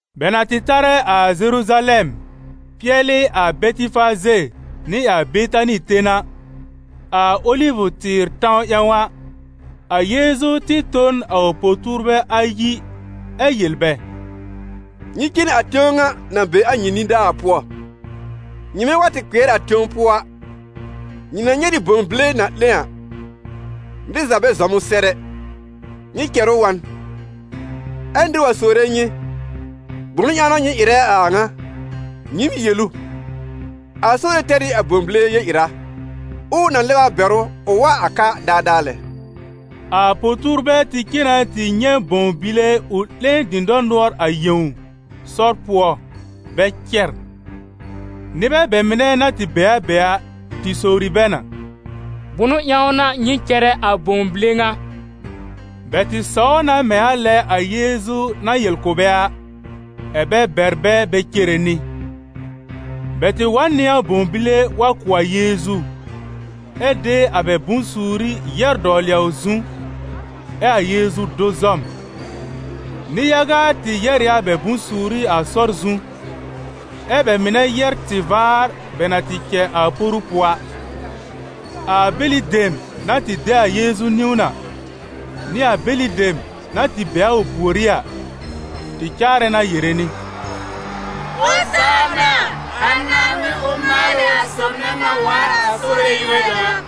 Bɛ na tɩ tarɛ a Zeruzalɛm, pɩɛlɩ a Bɛtɩfaze nɩ a Betani ten a, a Olivʋ-tɩɩr tãw ƴãw a, a Yeezu tɩ tõ n a ʋ po-tuurbɛ ayi ɛ yel bɛ: «Nyɩ cen a tẽw ŋa na be a nyɩ nidaa a pʋɔ. Nyɩmɛ wa tɩ kpɩɛr a tẽw pʋɔ a, nyɩ na nyɛ̃ nɩ bõw bile na 'lẽ a. Nɩr za bɛ zɔm ʋ sɛr ɛ, nyɩ cɛr ʋ wa n. Ɛ nɩr wa sowre nyɩ: ‹Bʋnʋ ƴãw n'a nyɩ ɩrɛ a a ŋa?› Nyɩɩm yel ʋ: ‹A Sore tɛr ɩ a bõw bile yel-ɩra, ɛ ʋ na lɛb a bɛr ʋ ʋ wa a ka daadaa lɛ.›» A po-tuurbɛ tɩ cen na tɩ nyɛ̃ bõw bile ʋ 'lẽ dɩ̃dɔr nʋɔr a yẽw, sɔr pʋɔ, bɛ cɛr. Nɩbɛ bɛ mɩnɛ na tɩ be a be a, tɩ sowri bɛ na: «Bʋnʋ ƴãw n'a nyɩ cɛrɛ a bõw bile ŋa?» Bɛ tɩ sɔw na mɛ̃ a lɛ a Yeezu na yel kʋ̀ bɛ a, ɛ̀ bɛ bɛr bɛ bɛ cere nɩ. Bɛ tɩ wa n nɩ a bõw bile wa kʋ̀ a Yeezu, ɛ de a bɛ bʋ̃-suuri yɛ́r dɔwlɩ a ʋ zu, ɛ a Yeezu do zɔm. Nɩ-yaga tɩ yɛ́r ɩ a bɛ bʋ̃-suuri a sɔr zu, ɛ bɛ mɩnɛ yɛ́r tɩ-vaar bɛ na tɩ cɛ a poru pʋɔ a. A bɛlɩ dem na tɩ de a Yeezu niwn a, nɩ a bɛlɩ dem na tɩ be a pùorí a, tɩ caarɛ na yere nɩ: «Ozaana! A Naaŋmɩn, ʋ maalɩ a sob nɛ na waar a Sore yúor ƴãw a!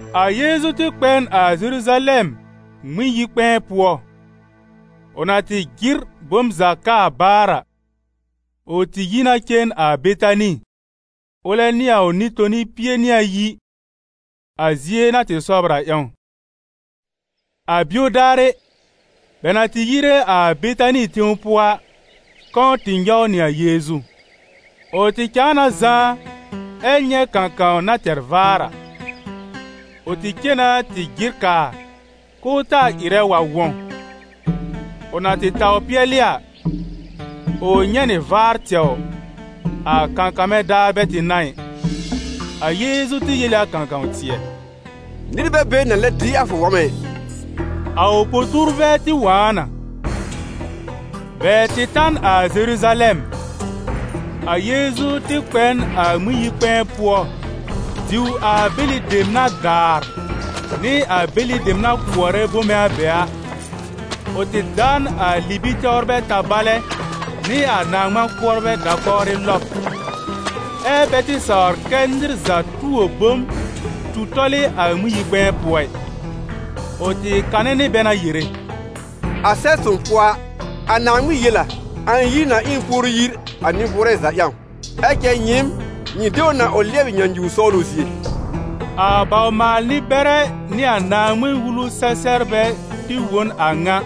A Yeezu tɩ kpɛ n a Zeruzalɛm Ŋmɩn-yi-kpɛ̃ɛ pʋɔ. Ʋ na tɩ jɩr bom za kaa baar a, ʋ tɩ yi na cen a Betani, ʋlɛ nɩ a ʋ Nɩ-toni pie nɩ ayi, a zie na tɩ sɔbr a ƴãw. A bio daarɩ, bɛ na tɩ yire a Betani tẽw pʋɔ a, kɔ̃ tɩ nyɔw nɩ a Yeezu. Ʋ tɩ cãa na zãá, ɛ nyɛ̃ kãkãw na tɛr vaar a. Ʋ tɩ cen na tɩ jɩr kaa k'ʋʋ taa ɩrɛ wa wɔ̃. Ʋ na tɩ taw pɩɛlɩ a, ʋ nyɛ̃ nɩ vaar tɛwr, a kãkãmɛ daar bɛ tɩ n'a ɩ. A Yeezu tɩ yel ɩ a kãkã-tɩɛ: «Nɩr bɛ be na lɛb dɩ a fʋ wɔ̃mɛ ɩ!» A ʋ po-tuurbɛ tɩ wõ a na. Bɛ tɩ ta n a Zeruzalɛm. A Yeezu tɩ kpɛ n a Ŋmɩn-yi-kpɛ̃ɛ pʋɔ diw a bɛlɩ dem na daar, nɩ a bɛlɩ dem na kʋɔrɛ bome a be a; ʋ tɩ da n a libi-tɛwrbɛ tabalɛ nɩ a na-ŋmã-kʋɔrbɛ da-kɔwrɩ lɔb, ɛ́ bɛ tɩ sawr kɛ́ nɩr za tuo bom tu tɔl ɩ a Ŋmɩn-yi-kpɛ̃ɛ pʋɔ ɩ. Ʋ tɩ kanɛ nɩ bɛ na yere: «A Sɛb-sõw pʋɔ a, a Naaŋmɩn yel: ‹A ɩ̃ yir na ɩ n puoru yir a nɩ-bʋʋrɛ za ƴãw› ɛ cɛ nyɩɩm, nyɩ de ʋ na ʋ lɩɛbɩ nyãnyuwr sɔwlʋ zie.» A bawr-maal-nɩ-bɛrɛ nɩ a Naaŋmɩn-Wulu-sɛ-sɛbrbɛ tɩ wõ n a ŋa,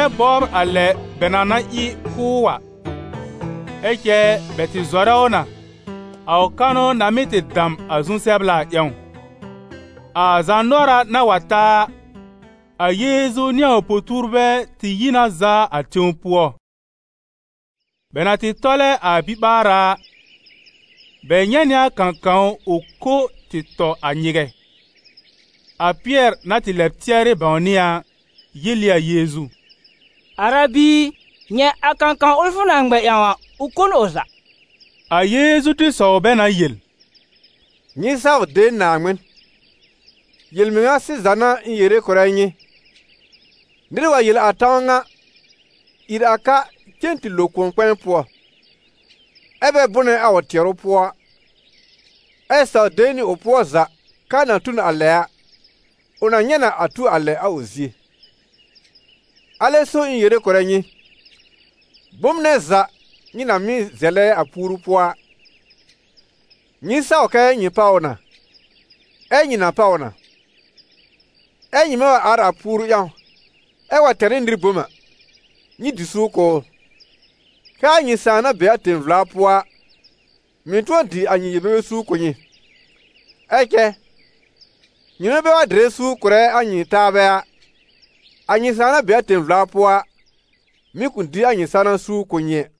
ɛ bɔbr a lɛ bɛ na na ɩ kʋ́ ʋ a. Ɛ cɛ bɛ tɩ zɔrɛ ʋ na, a ʋ kanʋ na mɩ́ tɩ dam a zu-sɛbla a ƴãw. A zaanʋɔra na wa ta a, a Yeezu nɩ a ʋ po-tuurbɛ tɩ yi na zaa a tẽw pʋɔ. Bɛ na tɩ tɔlɛ a biɓaara a, bɛ nyɛ̃ nɩ a kãkãw ʋ ko tɩ tɔ a nyɩgɛ. A Pɩɛr na tɩ lɛb tɩɛrɩ bãwnɩ a a, yel ɩ a Yeezu: «Arabi i, nyɛ̃, a kãkãw ʋl fʋ na ŋmɛ ƴãw a, ʋ kò n ʋ za.» A Yeezu tɩ sɔw bɛ na yel: «Nyɩ saw de Naaŋmɩn. Yel-mɩŋa sɩza n'a ɩ̃ yere kʋ̀rɛ nyɩ, nɩr wa yel a tãw ŋa: ‹Ìr a ka cen tɩ lo kʋ̃ɔ-kpɛ̃ɛ pʋɔ›, ɛ bɛ bʋnɛ a ʋ tɩɛrʋ pʋɔ, ɛ saw de nɩ ʋ pʋɔ za k'aa na tu n a lɛ a, ʋ na nyɛ̃ na a tu a lɛ a ʋ zie. Alɛ so ɩ̃ yere kʋ̀rɛ nyɩ: bom nɛ za nyɩ na mɩ́ zɛlɛ a puoru pʋɔ a, nyɩ saw kɛ nyɩ páw ʋ na, ɛ nyɩ na páw ʋ na. Ɛ nyɩmɛ wa ar a puoru ƴãw, ɛ wa tɛr ɩ nɩr bom a, nyɩ dɩ suur kʋ̀ ʋ, kɛ́ a nyɩ Sãà na be a tẽ-vla pʋɔ a, mɩ̀ tʋ̃ɔ dɩ a nyɩ yel-bebe suur kʋ̀ nyɩ. [ Ɛ cɛ nyɩmɛ bɛ wa dɩrɛ suur kʋ̀rɛ a nyɩ taabɛ a, a nyɩ Sãà na be a tẽ-vla pʋɔ a, mɩ̀ kʋ̃ dɩ a nyɩ sãwna suur kʋ̀ nyɩ ɛ.»]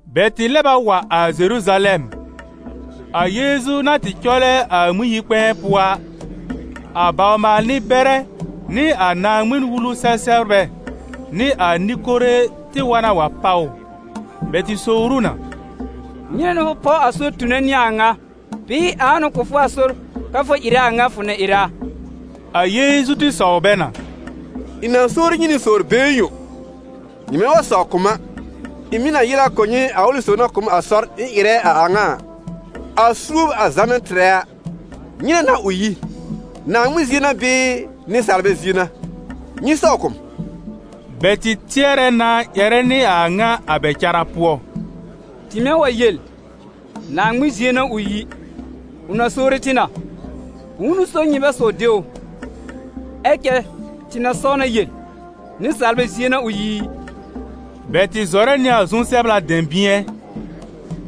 Bɛ tɩ lɛb a wa a Zeruzalɛm. A Yeezu na tɩ cɔlɛ a Ŋmɩn-yi-kpɛ̃ɛ pʋɔ a, a bawr-maal-nɩ-bɛrɛ nɩ a Naaŋmɩn-Wulu-sɛ-sɛbrbɛ nɩ a nɩ-kore tɩ wa na wa páw ʋ. Bɛ tɩ sowr ʋ na: «Nyɩnɛ n'a fʋ páw sɔr tone nɩ a a ŋa? Bɩɩ ãa n'ʋ kʋ̀ fʋ sɔr, kɛ́ fʋ ɩrɛ a a ŋa fʋ na ɩrɛ a?» A Yeezu tɩ sɔw bɛ na: «Ɩ̃ na sowri nyɩ nɩ sowr-been yõ, nyɩmɛ wa sɔw kʋ̀ m a, ɩ̃ mɩ̀ na yel a kʋ̀ nyɩ a ʋlɩ sob na kʋ̀ m a sɔr ɩ̃ ɩrɛ a a ŋa a. A suob a Zã na tɩ tɩrɛ a, nyɩnɛ n'a ʋ yi? Naaŋmɩn zie n'a bɩɩ nɩsaalbɛ zie n'a? Nyɩ sɔw kʋ̀ m!» Bɛ tɩ tɩɛrɛ na ƴɛrɛ nɩ a ŋa a bɛ cara pʋɔ: «Tɩmɛ wa yel: ‹Naaŋmɩn zie n'a ʋ yi›, ʋ na sowri tɩ na: ‹Bʋ̃ʋ n'ʋ so nyɩ bɛ saw de ʋ?› Ɛ cɛ tɩ na saw na yel: ‹Nɩsaalbɛ zie n'a ʋ yi i?›» Bɛ tɩ zɔrɛ nɩ a zu-sɛbla dɛ̃bɩ̃ɛ.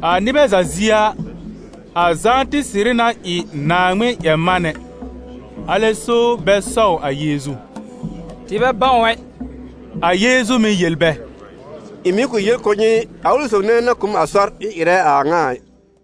A nɩbɛ za zie a, a Zã tɩ sɩrɩ na ɩ Naaŋmɩn-ƴɛr-manɛ. Alɛ so bɛ sɔw a Yeezu: «Tɩ bɛ bãw ɛ!» A Yeezu mɩ̀ yel bɛ: «Ɩ̃ mɩ̀ kʋ̃ yel kʋ̀ nyɩ a ʋlɩ sob nɛ na kʋ̀ m sɔr ɩ̃ ɩrɛ a a ŋa ɩ.»